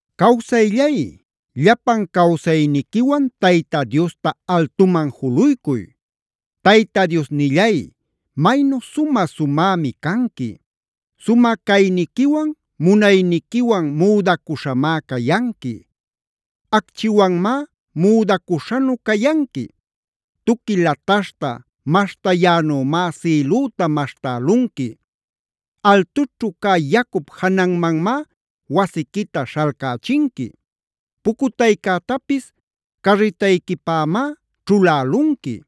Cawsayllay, llapan cawsayniquiwan Tayta Diosta altuman juluycuy. Tayta Diosnillay, maynu sumä-sumämi canqui. Sumä cayniquiwan, munayniquiwan müdacüśhamá cayanqui. Acchiwanmá müdacüśhanu cayanqui.a Tuqui lataśhta maśhtayänümá sïlüta maśhtälunqui. Altućhu cä yacup jananmanmá wasiquita śhalcächinqui. Pucutaycätapis carritayquipämá ćhulälunqui.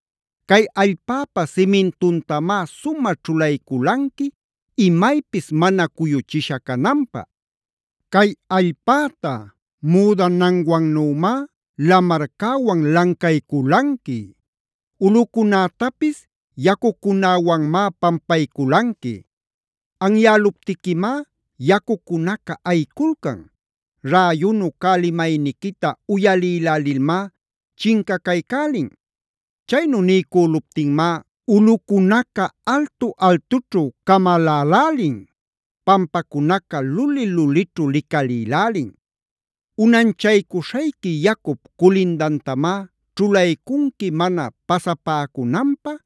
Cay allpäpa simintuntamá sumä ćhulayculanqui imaypis mana cuyuchisha cananpä. Cay allpäta müdananwannümá lamarcäwan lancayculanqui. Ulꞌucunätapis yacucunäwanmá pampayculanqui. Anyäluptiquimá yacucunaca ayiculcan. Räyunu cä limayniquita uyalïlälilmá chincacaycälin. Chaynu niycüluptinmá ulꞌucunaca altu-altućhu camalälälin. Pampacunaca luli-lulićhu licalïlälin. Unanchaycuśhayqui yacup culindantamá ćhulaycunqui mana pasapäcunanpä,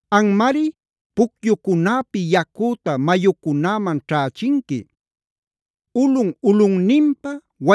Anmari pucyucunäpi yacüta mayucunäman ćhächinqui. Ulꞌun-ulꞌunninpa,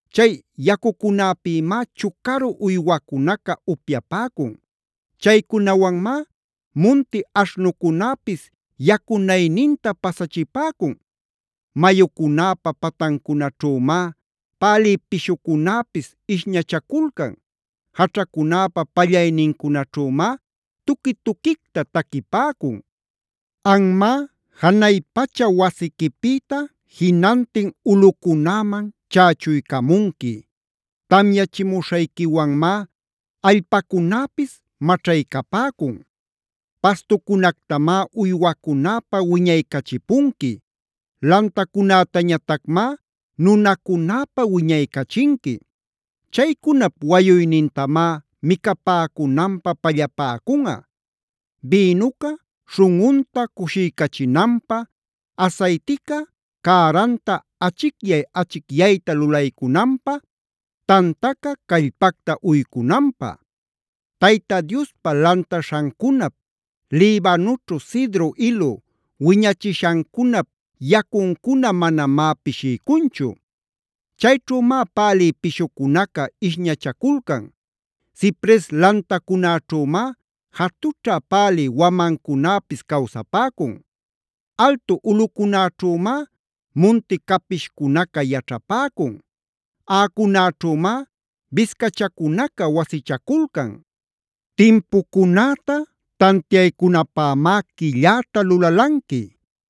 Chay yacucunapïmá chucaru uywacunaca upyapäcun. Chaycunawanmá munti aśhnucunäpis yacunayninta pasachipäcun. Mayucunäpa patancunaćhümá pälï pishucunäpis ishñachaculcan. Jaćhacunäpa pallaynincunaćhümá tuqui-tuquicta taquipäcun. Anmá janay pacha wasiquipïta jinantin ulꞌucunäman chächuycamunqui. Tamyachimuśhayquiwanmá allpacunäpis maćhaycapäcun. Pastucunactamá uywacunäpä wiñaycachipunqui. Lantacunätañatacmá nunacunäpä wiñaycachinqui. Chaycunap wayuynintamá micapäcunanpä pallapäcunꞌa: bïnuca śhunꞌunta cushiycachinanpä, asaytica cäranta achicyay-achicyayta lulaycunanpä, tantaca callpacta uycunanpä. Tayta Diospa lantaśhancunap, Libanoćhu cedro ilu wiñachishancunap yacuncuna manamá pishiycunchu. Chayćhümá pälï pishucunaca ishñachaculcan. Cipres lantacunaćhümá jatućha pälï wamancunäpis cawsapäcun. Altu ulꞌucunäćhümá munti capishcunaca yaćhapäcun. Aꞌacunäćhümáf biscachacunaca wasichaculcan. Timpucunäta tantiaycunapämá quilläta lulalanqui.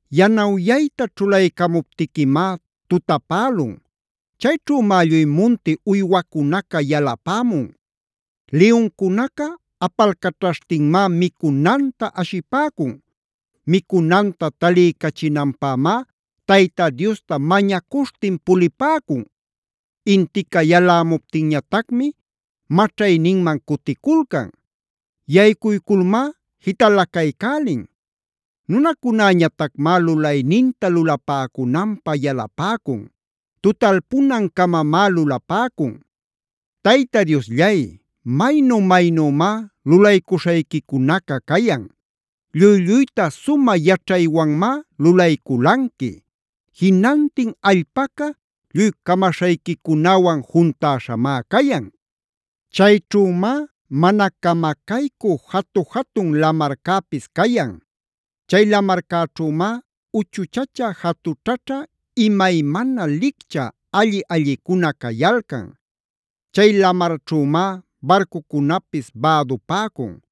Yanawyayta ćhulaycamuptiquimá tutapälun. Chayćhümá lluy munti uywacunaca yalapämun. Liyuncunaca apalcaćhaśhtinmá micunanta ashipäcun. Micunanta taliycachinanpämá Tayta Diosta mañacuśhtin pulipäcun. Intica yalämuptinñatacmi maćhayninman cuticulcan. Yaycuyculmá jitalacaycälin. Nunacunäñatacmá lulayninta lulapäcunanpä yalapäcun. Tutalpunan-camamá lulapäcun. Tayta Diosllay, maynu-maynümá lulaycuśhayquicunaca cayan. Lluy-lluyta sumä yaćhaywanmá lulayculanqui. Jinantin allpaca lluy camaśhayquicunäwan juntäśhamá cayan. Chayćhümá mana camacaycü jatu-jatun lamarcäpis cayan. Chay lamarcäćhümá uchuchacha jatućhaćha imaymana licchä alli-allicuna cayalcan. Chay lamarćhümá barcucunapis bädupäcun.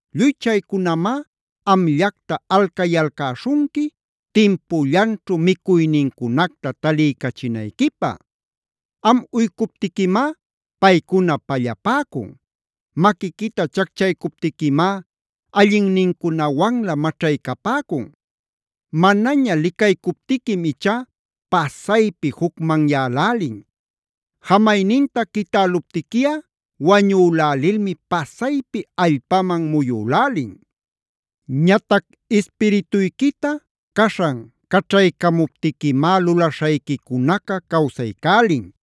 Lluy chaycunamá amllacta alcayalcäśhunqui, timpullanćhu micuynincunacta taliycachinayquipä. Am uycuptiquimá paycuna pallapäcun. Maquiquita chacchaycuptiquimá allinnincunawanlä maćhaycapäcun. Manaña licaycuptiquim ichá pasaypi jucmanyälälin. Jamayninta quitäluptiquiꞌa wañülälilmi pasaypi allpaman muyülälin. Ñatac ispirituyquita caśhan caćhaycamuptiquimá lulaśhayquicunaca cawsaycälin.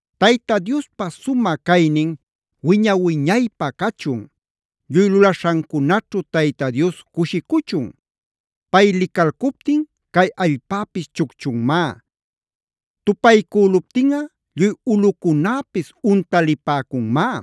¡Tayta Diospa sumä caynin wiña-wiñaypä cachun! ¡Lluy lulaśhancunaćhu Tayta Dios cushicuchun! Pay licalcuptin cay allpäpis chucchunmá. Tupaycüluptinꞌa lluy ulꞌucunäpis untalipäcunmá.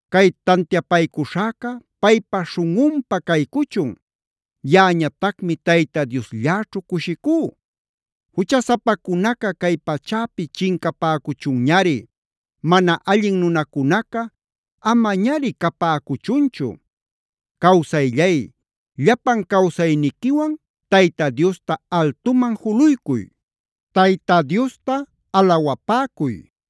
Cay tantiapaycuśhäca paypa śhunꞌunpä caycuchun. Yaꞌañatacmi Tayta Dioslläćhu cushicú. Juchasapacunaca cay pachäpi chincapäcunchunñari. Mana allin nunacunaca amañari capäcuchunchu. ¡Cawsayllay, llapan cawsayniquiwan Tayta Diosta altuman juluycuy! ¡Tayta Diosta alawapäcuy!